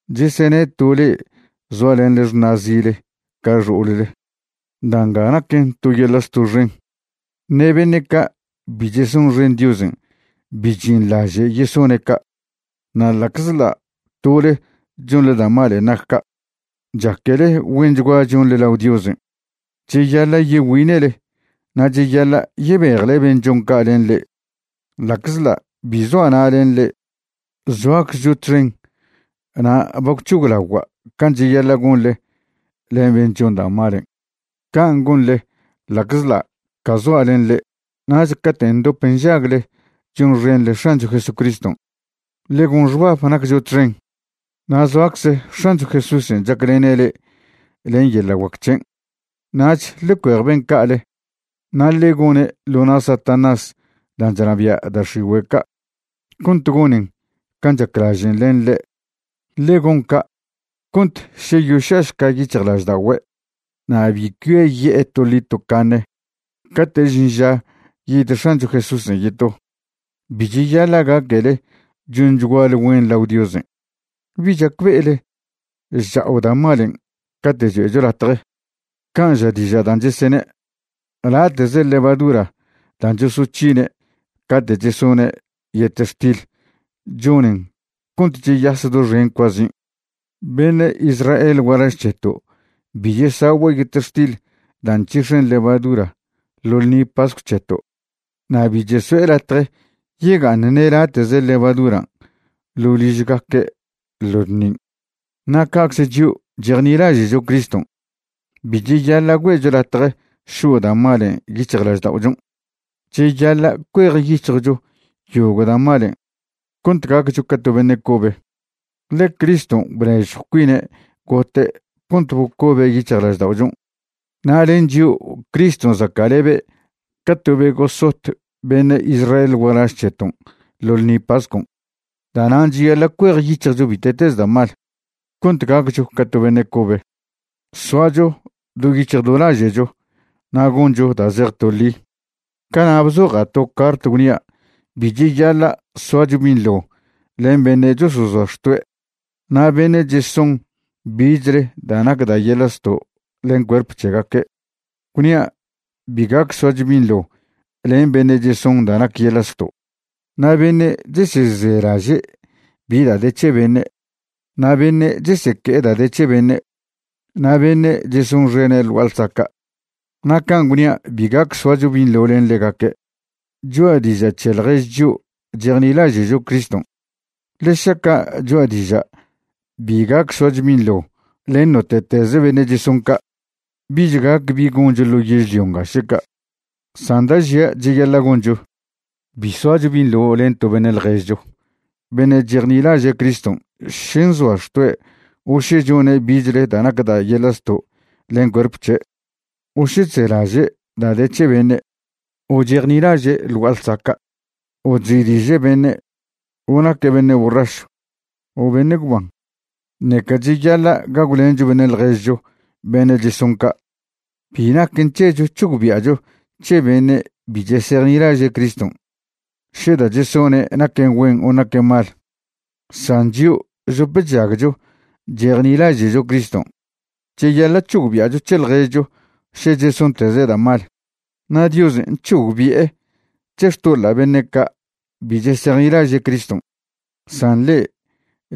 Chesene' to le'e zoalenḻe xṉa'zile ca xo'olle. Da' nga naquen to yeḻa' zto' xen, ṉe beṉe' ca' bi chesonxen Diosen' bi chžinḻaže' yesone' ca'. Na' ḻa'czḻa' tole chonḻe da' malen' nac ca', chaquele güenchgua chonḻe lao Diosen'. Cheyaḻa' yegüine'le na' cheyaḻa' yebejle ben' chon ca' len le'e. Ḻa'czḻa' bi zoa' na' len le'e, zoaczcho txen na' ba gwc̱hoglagua' can' cheyaḻa' gonḻe len ben' chon da' malen', can' gonḻe ḻa'czḻa' ca zoa' len le'e. Nach cate' ndop nžagle chonxenḻe X̱ancho Jesucriston', ḻe gon xbab naccho txen, na' zoacze X̱ancho Jesúsen' chaclene' le'e len yeḻa' guac c̱hen'. Nach ḻe cuej ben' ca'ale na' ḻe goṉe' ḻo na' Satanás dan' chnabia' da' x̱igüe' ca' cont gonen can' chaclažen' len ḻe'. Ḻe gon ca' cont še yoša'šca yic̱hjlažda'ogüe' na' bi cuiaye'e toḻi tocaṉe cate' žin ža yid X̱ancho Jesúsen' yeto. Bi cheyaḻa' gaquele chonchguale güen lao Diosen'. ¿Bi chacbe'ele chcha'o da' malen' cate' cho'echo latje, can' ža diža' dan' chesene': “Late'ze levadura da' chosoc̱hine' cate' chesone' yetextil chonen cont cheyas doxen cuazin'”? Beṉe' Israel gualaž c̱heto' bi chesagüe' yetextil da' nc̱hix̱en levadura ḻo ḻṉi pascw c̱heto' na' bi cheso'e latje yega'aṉ ṉe late'ze levaduran' ḻo' ližgaque' ḻo ḻṉin'. Na' ca'cze chio' chejnilaže'cho Criston' bi cheyaḻa' güe'cho latje šo' da' malen' yic̱hjlažda'ochon'. Cheyaḻa' cuejyic̱hjcho yogo' da' malen' cont gaccho ca to beṉe' cobe, ḻe Criston' bnežjw cuine' gote' cont bocobe' yic̱hjlažda'ochon', na' len chio' Criston' zaca'lebe' ca to be gosot beṉe' Israel gualaž c̱heton' ḻo ḻṉi pascon'. Da'nan' cheyaḻa' cuejyic̱hjcho bite'teze da' mal, cont gaccho ca to beṉe' cobe, soacho do yic̱hj do laže'cho na' goncho da' zej to ḻi. Cana' bzoja' to cart gwnia' bi cheyaḻa' soacho binḻo len beṉe' chosozoa xtoe' na' beṉe' cheson bichle da' nac da' yeḻa' zto' len cuerp c̱hegaque'. Gwnia' bi gac soacho binḻo len beṉe' cheson da' nac yeḻa' zto', na' beṉe' chesezelaže' bi da' de c̱he beṉe', na' beṉe' cheseque'e da' de c̱he beṉe' na' beṉe' chesonxene' ḻ gua'a ḻsaca'. Na' can' gwnia' bi gac soacho binḻo len ḻegaque', cho'a diža' c̱he ḻjež chio' chejnilaže'cho Criston'. Ḻe šaca' choa' diža' bi gac soacho binḻo len note'tez beṉe' cheson ca', bich gac bi goncho ḻo yežlio nga še ca'. San da' žia' cheyaḻa' goncho, bi soacho binḻo len to beṉe' ḻježcho beṉe' chejnilaže' Criston' še nzoa xtoe' o še chone' bichle da' nac da' yeḻa' zto' len cuerp c̱he', o še chzelaže' da' de c̱he beṉe', o chejnilaže' ḻ gua'a ḻsaca', o chzi'diže' beṉe', o naque' beṉe' borrašw o beṉe' gwban. Ṉeca cheyaḻa' gagwlencho beṉe' ḻježcho beṉe' cheson ca'. Bi naquen c̱hecho c̱hogbi'acho c̱he beṉe' bi chesejnilaže' Criston' še da' chesone' naquen güen o naquen mal, san chio' chdop chžagcho chejnilaže'cho Criston' cheyaḻa' c̱hogbi'acho c̱he ḻježcho še chesonteze' da' mal. Na' Diosen' c̱hogbi'e c̱he xtoḻa' beṉe' ca' bi chesejnilaže' Criston', san le'e,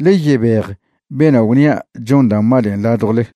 ḻe yebej bena' gwnia' chon da' malen' ladjwle.